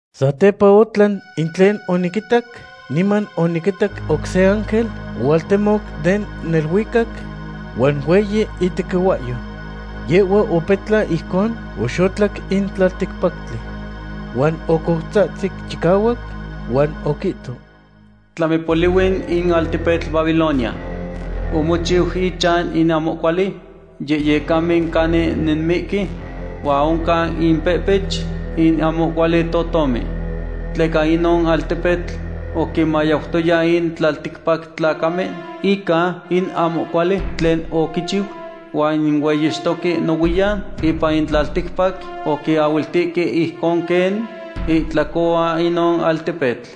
Satepa otlan in tlen oniquitac, niman oniquitac oc se ángel ohualtemoc den neluicac, huan hueyi itequihuahyo. Yehhua opetlan ijcon oxotlac in tlalticpactli. Huan ocoutzahtzic chicahuac huan oquihto: ―Tlami polihui in altepetl Babilonia. Omochiu inchan in ahmo cuali yehyecamen canin nemihque, huan oncan impehpech in ahmo cuali totomen. Tleca inon altepetl oquinmayautoya in tlalticpac tlacamen ica in ahmo cuali tlen oquichiu, huan in hueyixtoque nohuiyan ipan in tlalticpac oquiahuiltihque ijcon quen itlacohuan inon altepetl.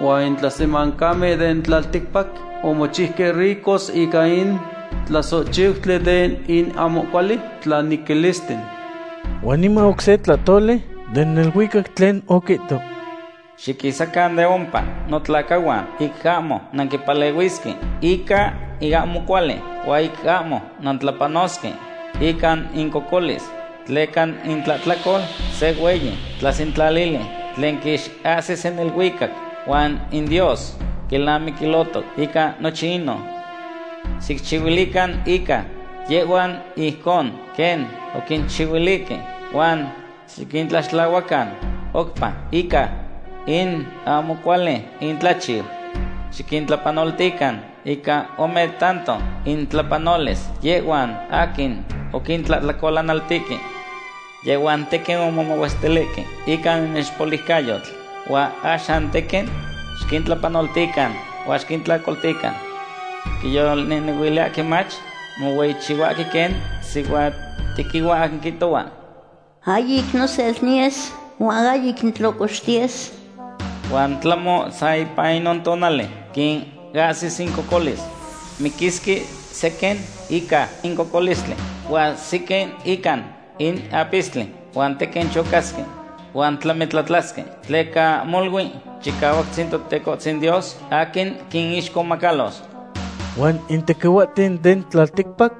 Huan in tlasemancamen den tlalticpac omochiuque ricos ica in tlasohchiutli den in ahmo cuali tlanequilisten. Huan niman oc se tlahtoli den neluicac tlen oquihto: ―Xiquisacan de ompa, notlacahuan, ic ahmo nanquimpalehuisque ica in ahmo cuali, huan ic ahmo nantlapanosque ica incocolis. Tleca intlahtlacol se hueyi tlasentlalili tlen quixahsis in neluicac, huan in Dios quilnamiquilotoc ica nochin inon. Xicchihuilican ica yehhuan ijcon quen oquinchihuilihque, huan xiquintlaxtlahuacan oupa ica in ahmo cuali intlachiu. Xiquintlapanoltican ica ome tanto intlapanolis yehhuan aquin oquintlahtlacolanaltihque. Yehhuan tequin omomahuestilihque ica inixpoliucayo, huan axan tequin xiquintlapanolitican huan xiquintlocoltican. Quiyolnehnehuiliyahque mach mohueyichihuahque quen sihuatequihua aquin quihtohua: “Ahyic nosel niyes, huan ahyic nitlocoxtiyes.” Huan tlahmo ipan san inon tonali quinahsis incocolis. Miquisque sequin ica in cocolistli, huan sequin ican in apistli, huan tequin chocasque, huan tlamitlatlasque, tleca molui Chicahuactzin Totecohtzin Dios aquin quinixcomacalos. Huan in tequihuahten den tlalticpac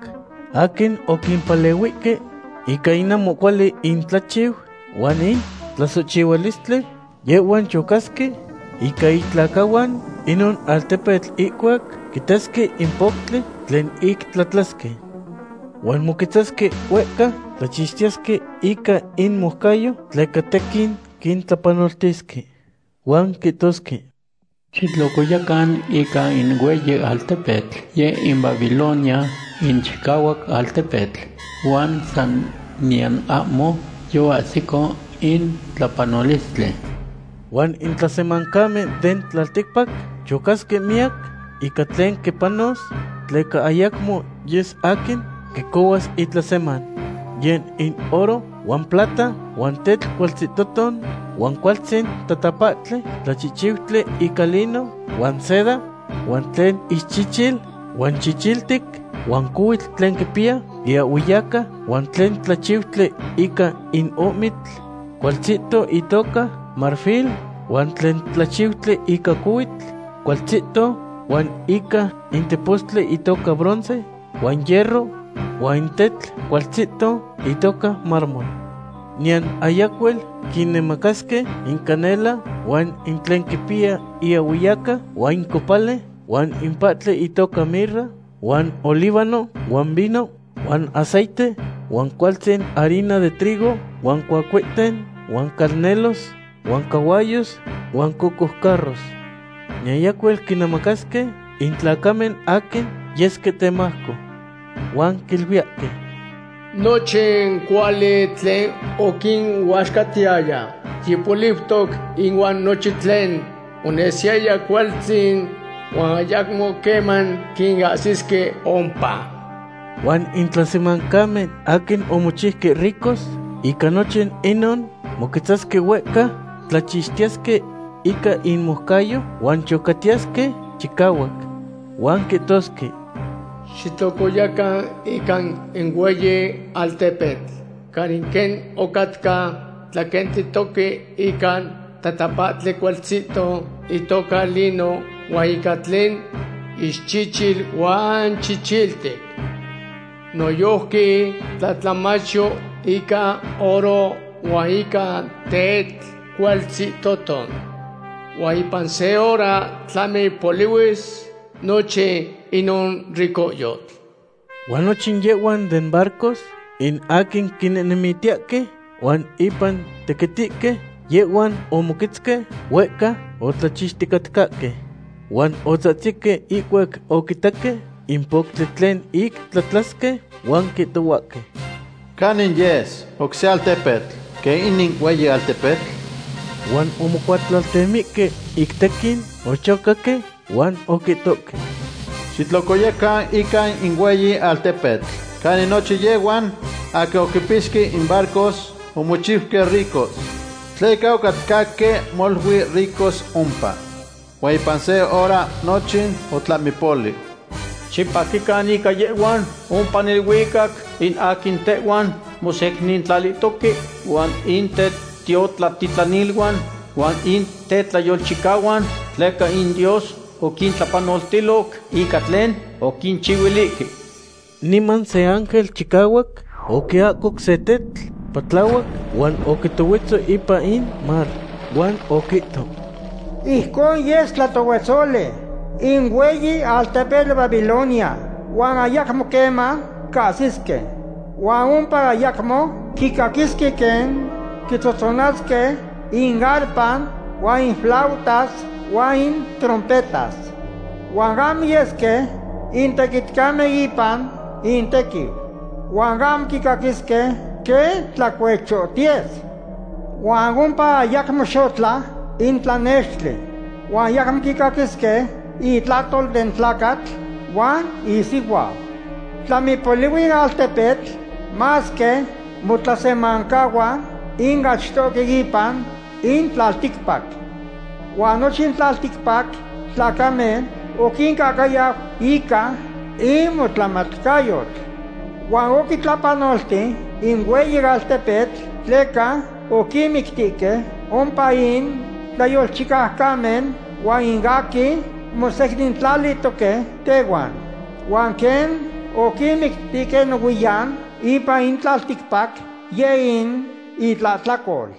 aquin oquimpalehuihque ica in ahmo cuali intlachiu huan in tlasohchihualistli, yehhuan chocasque ica itlacahuan inon altepetl ihcuac quitasque in poctli tlen ic tlatlasque. Huan moquetzasque huehca tlachixtiyesque ica inmoucayo, tleca tequin quintlapanoltisque. Huan quihtosque: ―Xitlocoyacan ica in hueyi altepetl, yeh in Babilonia in chicahuac altepetl. Huan san niyan ahmo yoahsico in tlapanolistli. Huan in tlasemancamen den tlalticpac chocasque miyac ica tlen quipanos, tleca ayacmo yes aquin quicohuas itlaseman. Yeh in oro, huan plata, huan tetl cualtzihtoton, huan cualtzin tatapahtli tlachihchiutli ica lino huan seda, huan tlen ixchichil huan chichiltic, huan cohuitl tlen quipiya iahhueyaca, huan tlen tlachiutli ica in ohmitl cualtzihto itoca marfil, huan tlen tlachiutli ica cohuitl cualtzihto, huan ica in tepostli itoca bronce huan hierro, huan in tetl cualtzihto itoca mármol. Niyan ayacuel quinemacasque in canela, huan in tlen quipiya iahhueyaca, huan in copali, huan in pahtli intoca mirra huan olíbano, huan vino, huan aceite, huan cualtzin harina de trigo, huan cuahcuehten, huan calnelos, huan cahuayos, huan cocoucarros. Niyan ayacuel quinemacasque in tlacamen aquin yesque temajco. Huan quiluiyahque: ―Nochin cuali tlen oquinuaxcatiyaya yipoliutoc ihuan nochin tlen onesiyaya cualtzin, huan ayacmo queman quinahsisque ompa. Huan in tlasemancamen aquin omochiuque ricos ica nochin inon moquetzasque huehca, tlachixtiyesque ica inmoucayo, huan chocatiyesque chicahuac. Huan quihtosque: ―Xitlocoyacan ica in hueyi altepetl canin quen ocatca tlaquentitoque ica tatapahtli cualtzihto itoca lino, huan ica tlen ixchichil huan chichiltic. Noyojqui tlatlahmachyo ica oro huan ica tetl cualtzihtoton. Huan ipan se hora tlami polihuis nochin inon ricohyotl. Huan nochin yehhuan den barcos, in aquin quinehnemitiyahque huan impan tequitihque, yehhuan omoquetzque huehca otlachixticatcahque. Huan otzahtzihque ihcuac oquitaque in poctli tlen ic tlatlasque, huan quihtohuahque: ―¿Canin yes oc se altepetl quen inin hueyi altepetl? Huan omocuatlaltemihque ic tequin ochocaque huan oquihtohque: ―Xitlocoyacan ica in hueyi altepetl canin nochin yehhuan aquin oquipixque in barcos omochiuque ricos. Tleca ocatcahque molui ricos ompa. Huan ipan se hora nochin otlamipoliu. Xipaquican ica yehhuan ompa neluicac, in aquin tehuan mosecnintlalihtoque huan in tetiotlatitlaniluan huan in tetlayolchicahuan, tleca in Dios oquintlapanoltiloc ica tlen oquinchihuilihque. Niman se ángel chicahuac oquiahcoc se tetl patlahuac huan oquitohuetzo ipan in mar. Huan oquihto: ―Ijcon yes tlatohuetzoli in hueyi altepetl Babilonia, huan ayacmo queman cahsisque. Huan ompa ayacmo quicaquisque quen quitzotzonasque in arpa huan in flautas huan in trompetas. Huan ahmo yesque in tequitcamen ipan intequiu. Huan ahmo quicaquisque quen tlacuechotiyes. Huan ompa ayacmo xotla in tlanextli. Huan ayacmo quicaquisque intlahtol den tlacatl huan isihuau. Tlamipolihui in altepetl masque motlasemancahuan in achtohque ipan in tlalticpac. Huan nochin tlalticpac tlacamen oquincahcayau ica in motlamatcayotl. Huan oquitlapanolti in hueyi altepetl tleca oquinmictique ompa in tlayolchicaucamen huan in aquin mosecnintlalihtoque tehuan. Huan quen oquinmictihque nohuiyan ipan in tlalticpac, yeh in itlahtlacol.